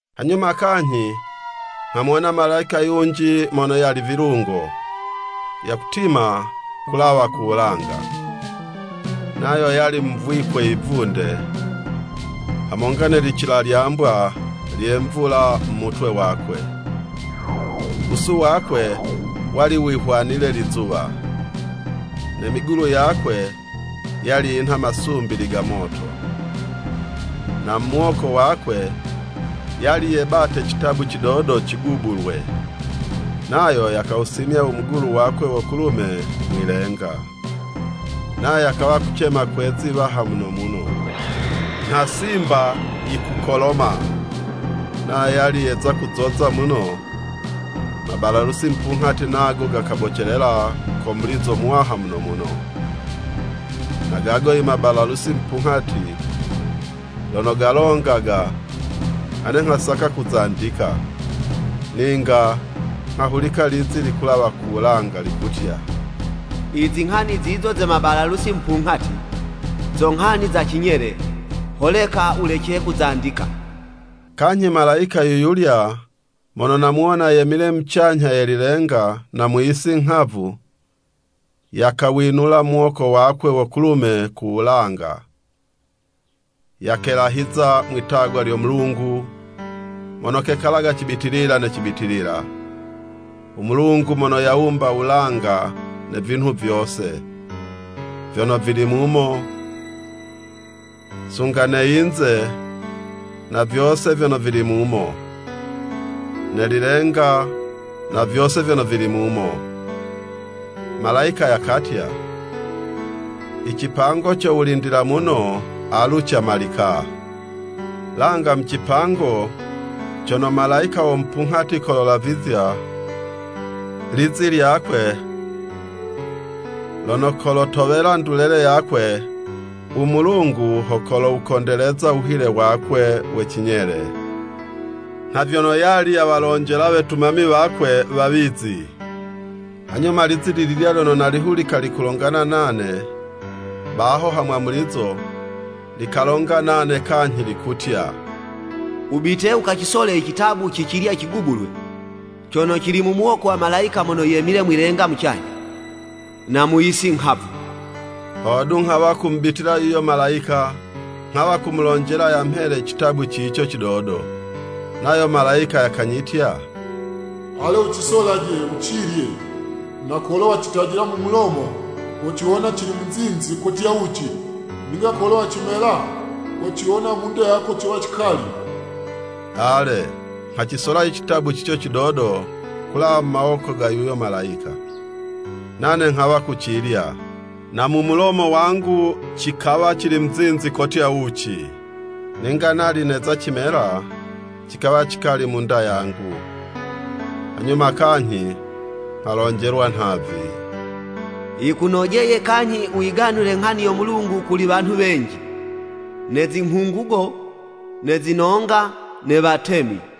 Hanyuma kanyhi nghamuwona malayika yunji mono yali vilungo, yakutima ku lawa kuwulanga. Nayo yali muvwikwe yivunde, hamonga ne licilalyambwa lye mvula mu mutwe wakwe. Wusu wakwe wali wihwanile lizuwa, ne migulu yakwe yali yinha masumbili ga moto. Na mu muwoko wakwe yali yebate citabu cidodo cigubulwe. Nayo yakawusimya u mugulu wakwe wo kulume mwi'lenga. Nayo yakawa kucema kwe'zi 'waha muno muno, nha simba yikukoloma. Nayo yali yeza kuzoza muno, mabalalusi mupunghati nago gakabocelela ko mulizo muwaha muno muno. Na gago i mabalalusi mupunghati lono galongaga, ane nghasaka kuzandika. Ninga nghahulika lizi likulawa ku wulanga, likutya, “Izinghani zizo ze mabalalusi mupunghati, zo nghani za cinyele, holeka wulece kuzandika!” Kanyhi malayika yuyulya mono namuwona yemile mucanyha ye lilenga na mu yisi nghavu, yakawinula muwoko wakwe wo kulume ku wulanga, yakelahiza mwi'tagwa lyo Mulungu mono kekalaga cibitilila ne cibitilila, u Mulungu mono yawumba wulanga ne vinhu vyose vyono vili mumo, sunga ne yinze na vyose vyono vili mumo, ne lilenga na vyose vyono vili mumo. Malayika yakatya, “I cipango co wulindila muno, alu camalika! Langa mu cipango cono malayika wo mupunghati kololavizya lizi lyakwe, lono kolotowela ndulele yakwe, u Mulungu ho kolowukondeleza u wuhile wakwe we cinyele, nha vyono yali yawalonjela wetumami wakwe, wawizi.” Hanyuma lizi li lilya lyono nalihulika likulongana nane baho ha mwamulizo, likalonga nane kanyhi, likutya, “Wubite wukacisole i citabu ci cilya cigubulwe, cono cili mu muwoko wa malayika mono yemile mwi'lenga mucanyha, na mu yisi nghavu.” Hodu, nghawa kumubitila yuyo malayika, nghawa kumulonjela, yamhele citabu cico cidodo. Nayo malayika yakanyitya, “Ale wucisolaje, wucilye, na kolo wacitajila mu mulomo, kociwona cili muzinzi kotya wuci, ninga kolo wacimela, kociwona mu'nda yako cowa cikali!” Ale, nghacisola i citabu cico cidodo kulawa mu mawoko ga yuyo malayika, nane nghawa kucilya, na mu mulomo wangu cikawa cili muzinzi kotya wuci, ninga nali neza cimela, cikawa cikali mu'nda yangu. Hanyuma kanyhi nghalonjelwa nhavi, “Yikunojeye kanyhi wuyiganule nghani yo Mulungu kuli wanhu wenji, ne zinghungugo, ne zinonga, ne watemi.”